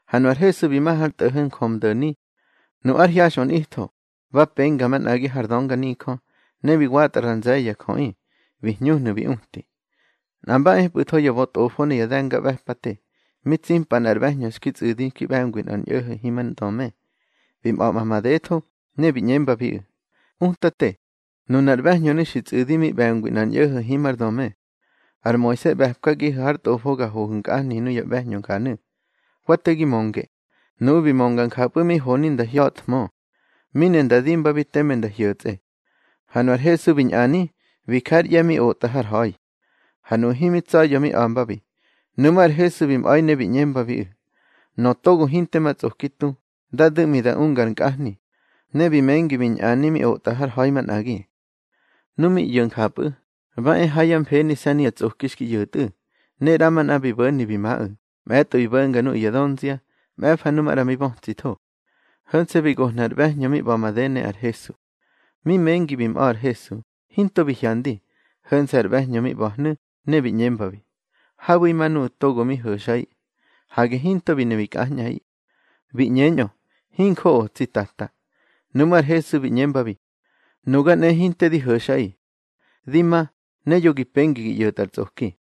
Ha nu ar Hesu bi ma har tꞌo̱ho̱ Njömdo̱ni. Nu ár hyaxꞌö nꞌitho, ba penga manꞌagi har dönganijö, ne bi watꞌa ra nze̱ye̱ ya jöꞌi, bi hñuhnu̱ bi uti. Nꞌa mba epꞌu̱tho ya bötꞌofo ne ya de̱ngaꞌbe̱pate, mi tsimpa nꞌar ꞌbe̱hñö xki tsꞌu̱di mi ꞌbe̱ngwi nꞌar ñꞌo̱ho̱ himár döme. Bi mꞌa̱ꞌma madetho, ne bi ꞌñembabiꞌu̱: —Utate, nunar ꞌbe̱hñönu̱ xi tsꞌu̱di mi ꞌbe̱ngwi nꞌar ñꞌo̱ho̱ himár döme. Ar Moise ꞌbe̱pkagihu̱ hár tꞌofo ga hohu̱ nkꞌahni nuya ꞌbe̱hñö njanu̱. Wa te gi mönge. Nuꞌu̱ bi mönga njapꞌu̱ mi honi nda hya̱thmö, mi ne nda dimbabi teme nda hyo̱tsꞌe. Ha nunar Hesu bi ñꞌani, bi ja ár ꞌye̱ mi otꞌa har ha̱i. Ha nuꞌu̱ himi tsa̱ya̱ mi a̱mbabi. Nuꞌmú̱ ar Hesu bi mꞌa̱i ne bi ꞌñembabiꞌu̱: —Nöꞌö togo hinte ma tsꞌoki tu, dá du̱ꞌmi da unga ar nkꞌahni. Ne bi mengi bi ñꞌani mi otꞌa har ha̱i manꞌagi. Nu mi ꞌyo̱ njapꞌu̱, ba e ha yá mfenise̱ nuyá tsꞌoki xki ꞌyo̱tꞌu̱, ne ꞌramanꞌa bi bo̱ni bi maꞌu̱, mꞌe̱tꞌo bi bo̱nga nuꞌu̱ ya dönzia, mꞌe̱fa nu maꞌra mi bötsitho. Ho̱nse̱ bi gohnu̱ ar ꞌbe̱hñö mi ꞌba̱ made, ne ar Hesu. Mi mengi bi mꞌa̱ ar Hesu, hinto bi hyandi, ho̱nse̱ ar ꞌbe̱hñö mi ꞌba̱hnu̱, ne bi ꞌñembabi: —Habu̱ima nuꞌu̱ togo mi ho̱xꞌaꞌi. Hage hinto bi ne bi kꞌañꞌaꞌi. Bi ꞌñeñꞌö: —Hinjoꞌo, tsi Tata. Nuꞌmú̱ ar Hesu bi ꞌñembabi: —Nuga nꞌe, hinte di ho̱xꞌaꞌi. Di ma, ne yo ma gi pengi gi ꞌyo̱tꞌa ar tsꞌoki.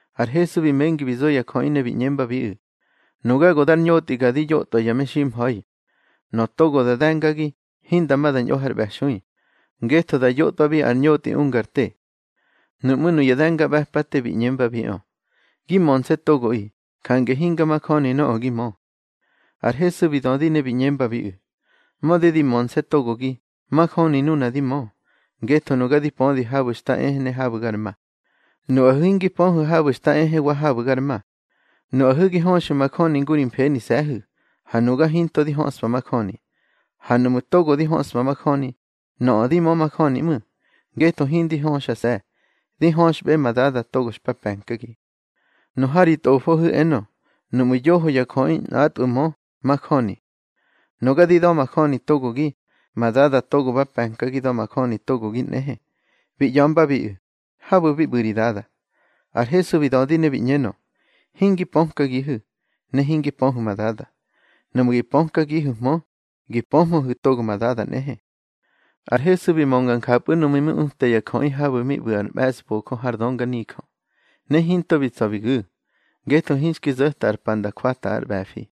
Ar Hesu bi mengi bi zo ya jöꞌi ne bi ꞌñembabiꞌu̱: —Nuga go dar ñotꞌiga di yotꞌwa ya meximha̱i. Nöꞌö togo da de̱ngagi, hinda ma da ñꞌo har ꞌbe̱xui, ngetho da yotꞌwabi ar ñotꞌi unga ar te. Nuꞌmú̱ nuya de̱ngaꞌbe̱pate bi ꞌñembabiꞌö: —Gi mönse̱ togoꞌi, jange hinga majöni nöꞌö gi mö. Ar Hesu bi dödi ne bi ꞌñembabiꞌu̱: —Mödi di mönse̱ togogi, majöni nuna di mö, ngetho nuga di pödi habu̱ xta ehe ne habu̱ gar ma. Nuꞌahu̱ hingi pöhu̱ habu̱ xta ehe wa habu̱ gar ma. Nuꞌahu̱ gi höxu̱ majöni ngu ri mfenise̱hu̱, ha nuga hinto di höꞌspa majöni. Ha nuꞌmu̱ togo di höꞌspa majöni, nöꞌö di mö majöni ꞌmu̱, ngetho hindi höxase̱, di höxꞌbe ma Dada togo xpa pe̱nkagi. Nu ha ri tꞌofohu̱ enö: Nuꞌmu̱ yoho ya jöꞌi nꞌatꞌwu̱ mö, majöni. Nuga di da̱majöni togogi, ma Dada togo ba pe̱nkagi da̱majöni togogi nꞌehe. Bi ꞌya̱mbabiꞌu̱: —Habu̱ bi ꞌbu̱ ri Dada. Ar Hesu bi dödi ne bi ꞌñenö: —Hingi pökagihu̱, ne hingi pöhu̱ ma Dada. Nuꞌmu̱ gi pökagihu̱hmö, gi pöhmöhu̱ togo ma Dada nꞌehe. Ar Hesu bi mönga njapꞌu̱ núꞌmu̱ mi uta ya jöꞌi núnu̱ habu̱ mi ꞌbu̱ ar mꞌe̱sbojö har dönganijö. Ne hinto bi tsa̱ bi gu̱, ngetho hinxki zo̱ta ar pa nda jwata ár ꞌbe̱fi.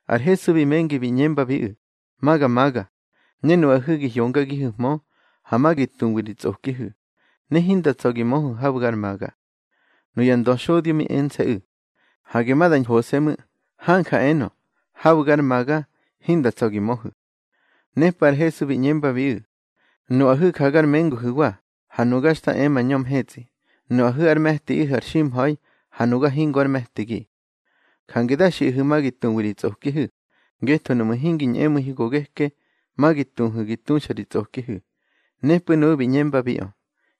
Ar Hesu bi mengi bi ꞌñembabiꞌu̱: —Ma ga maga, ne nuꞌahu̱ gi hyongagihu̱hmö. Ha ma gi tuwi ri tsꞌokihu̱, ne hinda tsa̱ gi möhu̱ habu̱ gar maga. Nuya ndöxodyo mi ense̱ꞌu̱: —Hage ma da ñhose̱ ꞌmu̱. Hanja enö: Habu̱ gar maga, hinda tsa̱ gi möhu̱. Nepꞌu̱ ar Hesu bi ꞌñembabiꞌu̱: —Nuꞌahu̱ ja gar menguhu̱wa, ha nuga xta e mañö mhetsꞌi. Nuꞌahu̱ ár me̱tiꞌihu̱ ar ximha̱i, ha nuga hingo ár me̱tigi. Jange da xiꞌahu̱ ma gi tuwi ri tsꞌokihu̱, ngetho nuꞌmu̱ hingi ñꞌemu̱ihu̱ go geke, ma gi tuhu̱ gi tuxta ri tsꞌokihu̱. Nepꞌu̱ nuꞌu̱ bi ꞌñembabiꞌö: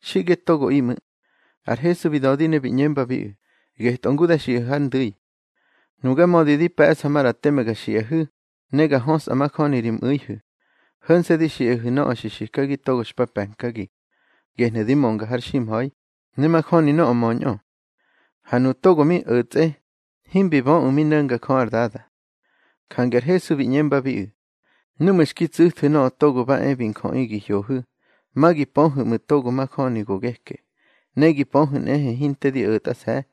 —Xiꞌge togoꞌi ꞌmu̱. Ar Hesu bi dödi ne bi ꞌñembabiꞌu̱: —Getꞌö ngu da xiꞌahu̱ har ndu̱i. Nuga mödi di pe̱ꞌsa maꞌra teme ga xiꞌahu̱, ne ga hösꞌa majöni ri mꞌu̱ihu̱, ho̱nse̱ di xiꞌahu̱ nöꞌö xi xikagi togo xpa pe̱nkagi. Gehnu̱ di mönga har ximha̱i, ne majöni nöꞌö möñꞌö. Ha nuꞌu̱ togo mi o̱tsꞌe, himbi böꞌu̱ mi no̱nga Jö ár Dada. Jange ar Hesu bi ꞌñembabiꞌu̱: —Núꞌmu̱ xki tsu̱thu̱ Nöꞌö Togo ba e bi Njöꞌi gi hyohu̱, ma gi pöhu̱ ꞌmu̱ togo xa majöni go geke. Ne gi pöhu̱ nꞌehe hinte di o̱tꞌase̱.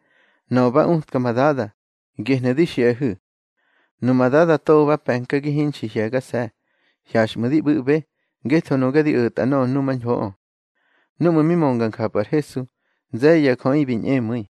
Nöꞌö ba utka ma Dada, gehnu̱ di xiꞌahu̱. Numa Dada togo ba pe̱nkagi hinxi hye̱gase̱, hyaxꞌmu̱ di ꞌbu̱ꞌbe, ngetho nuga di o̱tꞌa nöꞌö numañhoꞌö. Núꞌmu̱ mi mönga njapꞌu̱ ar Hesu, nze̱ye̱ ya jöꞌi bi ñꞌemu̱i.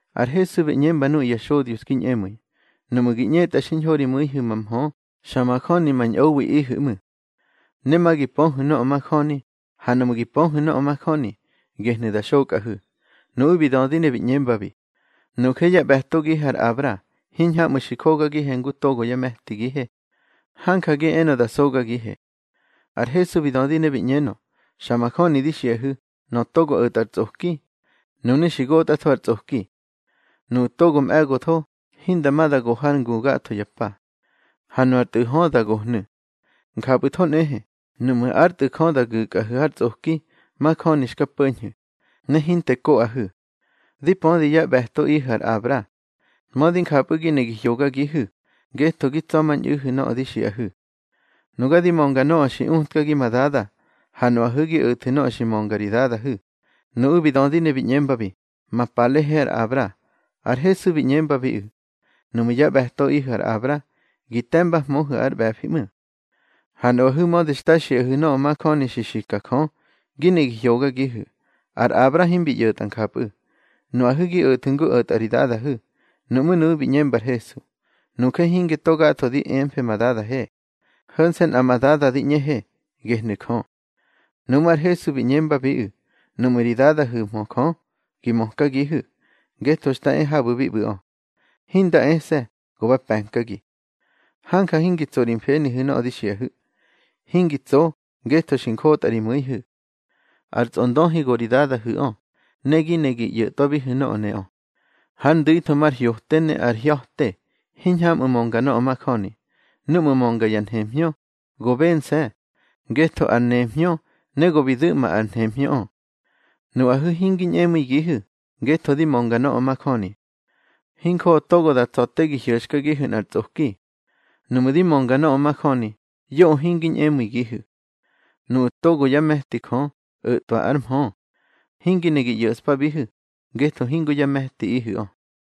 Ar Hesu bi ꞌñemba nuꞌu̱ ya xodyo xki ñꞌemu̱i: —Nuꞌmu̱ gi ꞌñetꞌa xiñho ri mu̱ihu̱ ma mhö, xa majöni ma ñꞌowiꞌihu̱ ꞌmu̱. Ne ma gi pöhu̱ nöꞌö majöni, ha nuꞌmu̱ gi pöhu̱ nöꞌö majöni, gehnu̱ da xokꞌahu̱. Nuꞌu̱ bi dödi ne bi ꞌñembabi: —Nuje yá ꞌbe̱togihe ar Abra. Hiñhamꞌu̱ xi jokagihe ngu togo yá me̱tigihe. Hanja gi enö da sogagihe. Ar Hesu bi dödi ne bi ꞌñenö: —Xa majöni di xiꞌahu̱, nöꞌö togo o̱tꞌa ar tsꞌoki, nunu̱ xi gotꞌatho ar tsꞌoki. Nuꞌu̱ togo mꞌe̱gotho, hinda ma da go har ngu gatho ya pa. Ha nu ar tꞌu̱ hö, da gohnu̱. Njapꞌu̱tho nꞌehe, nuꞌmu̱ ár Tꞌu̱ Jö da gu̱kꞌahu̱ har tsꞌoki, majöni xka po̱ñhu̱, ne hinte koꞌahu̱. Di pödi yá ꞌbe̱toꞌihu̱ ar Abra. Mödi njapꞌu̱ gi ne gi hyogagihu̱, ngetho gi tsa̱mañꞌu̱hu̱ nöꞌö di xiꞌahu̱. Nuga di mönga nöꞌö xi utkagi ma Dada, ha nuꞌahu̱ gi o̱thu̱ nöꞌö xi mönga ri dadahu̱. Nuꞌu̱ bi dödi ne bi ꞌñembabi: —Ma palehe ar Abra. Ar Hesu bi ꞌñembabiꞌu̱: —Nuꞌmu̱ yá ꞌbe̱toꞌihu̱ ar Abra, gi te̱mbahmöhu̱ ár ꞌbe̱fiꞌö ꞌmu̱. Ha nuꞌahu̱ mödi xta xiꞌahu̱ nöꞌö majöni xi xika Jö, gi ne gi hyogagihu̱. Ar Abra himbi ꞌyo̱tꞌa njapꞌu̱. Nuꞌahu̱ gi o̱thu̱ ngu o̱tꞌa ri dadahu̱. Nuꞌmú̱ nuꞌu̱ bi ꞌñemba ar Hesu: —Nuje hinge togatho di emfe ma dadahe. Ho̱nse̱ nꞌa ma Dada di ꞌñehe, gehnu̱ Jö. Nuꞌmú̱ ar Hesu bi ꞌñembabiꞌu̱: —Nuꞌmu̱ ri Dadahu̱hmö Jö, gi mökagihu̱, ngetho xta e habu̱ bi ꞌbu̱ꞌö. Hinda ese̱, go ba pe̱nkagi. Hanja hingi tso ri mfenihu̱ nöꞌö di xiꞌahu̱. Hingi tso, ngetho xi njotꞌa ri mu̱ihu̱. Ar tsꞌondöhi go ri dadahu̱ꞌö, ne gi ne gi ꞌyo̱thwu̱ nöꞌö neꞌö. Hár ndu̱itho mar hyote ne ar hya̱te, hiñhamꞌu̱ mönga nöꞌö majöni. Núꞌmu̱ mönga ya nhemhñö, go bense̱, ngetho ar nemhñö, ne go bi du̱ꞌma ar nhemhñöꞌö. Nuꞌahu̱ hingi ñꞌemu̱igihu̱, ngetho di mönga nöꞌö majöni. Hinjoꞌö togo da tsa̱ te gi hyo̱xkagihu̱ nꞌar tsꞌoki. Nuꞌmu̱ di mönga nöꞌö majöni, yoꞌö hingi ñꞌemu̱igihu̱. Nuꞌu̱ togo yá me̱ti Jö, o̱twa ár mhö. Hingi ne gi ꞌyo̱ꞌspabihu̱, ngetho hingo yá me̱tiꞌihu̱ꞌö.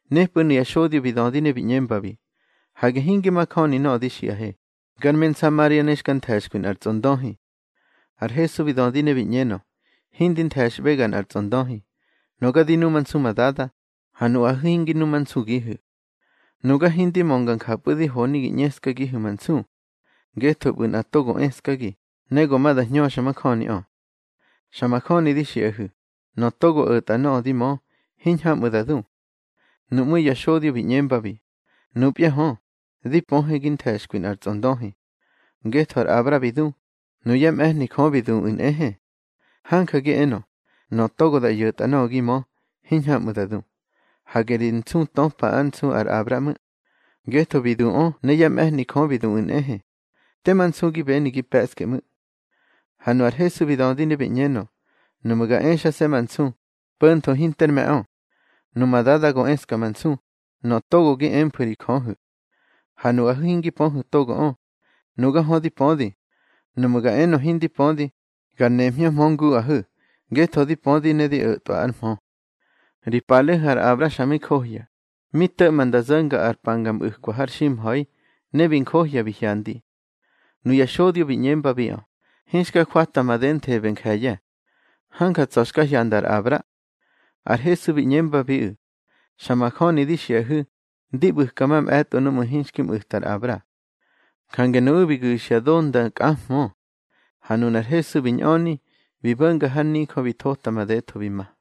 Nepꞌu̱ nuya xodyo bi dödi ne bi ꞌñembabi: —Hage hinge majöni nöꞌö di xiꞌahe, gar me Nsamaria ne xka nthe̱xkwi nꞌar tsꞌondöhi. Ar Hesu bi dödi ne bi ꞌñenö: —Hindi nthe̱xꞌbega nꞌar tsꞌondöhi. Nuga di numansu ma Dada, ha nuꞌahu̱ hingi numansugihu̱. Nuga hindi mönga njapꞌu̱ di honi gi ꞌñeskagihu̱ ma nsu. Ngetho ꞌbu̱ nꞌa togo eskagi, ne go ma da hñöxmajöniꞌö. Xa majöni di xiꞌahu̱, nöꞌö togo o̱tꞌa nöꞌö di mö, hiñhamꞌu̱ da du. Nuꞌmú̱ ya xodyo bi ꞌñembabi: —Nupya hö, di pöhe gi nthe̱xkwi nꞌar tsꞌondöhi. Ngetho ar Abra bi du, nuyá mꞌe̱hni Jö bi duꞌu̱ nꞌehe. Hanja gi enö, nöꞌö togo da ꞌyo̱tꞌa nöꞌö gi mö, hiñhamꞌu̱ da du. Hage ri nsu töpa ár nsu ar Abra ꞌmu̱. Ngetho bi duꞌö ne yá mꞌe̱hni Jö bi duꞌu̱ nꞌehe. Tema nsu gi beni gi pe̱ꞌske ꞌmu̱. Ha nu ar Hesu bi dödi ne bi ꞌñenö: —Nuꞌmu̱ ga exase̱ ma nsu, po̱ntho hinter me̱ꞌö. Numa Dada go eska ma nsu, nöꞌö togo gi emfu̱ ri Jöhu̱. Ha nuꞌahu̱ hingi pöhu̱ togoꞌö. Nuga hö di pödi. Nuꞌmu̱ ga enö hindi pödi, gar nemhñöhmö nguꞌahu̱, ngetho di pödi ne di o̱twa ár mhö. Ri palehu̱ ar Abra xa mi johya, mi to̱ꞌma nda zo̱nga ar pa nga ꞌbu̱kwa har ximha̱i, ne bi njohya bi hyandi. Nuya xodyo bi ꞌñembabiꞌö: —Hinxka jwata madenthebe nje̱ye̱. Hanja tsa̱ xka hyanda ar Abra. Ar Hesu bi ꞌñembabiꞌu̱: —Xa majöni di xiꞌahu̱, ndi ꞌbu̱ka mamꞌe̱tꞌo núꞌmu̱ hinxki mꞌu̱ta ar Abra. Jange nuꞌu̱ bi gu̱xya do nda kꞌahmö. Ha nunar Hesu bi ñꞌöni, bi bo̱nga har nijö bi thota madetho bi ma.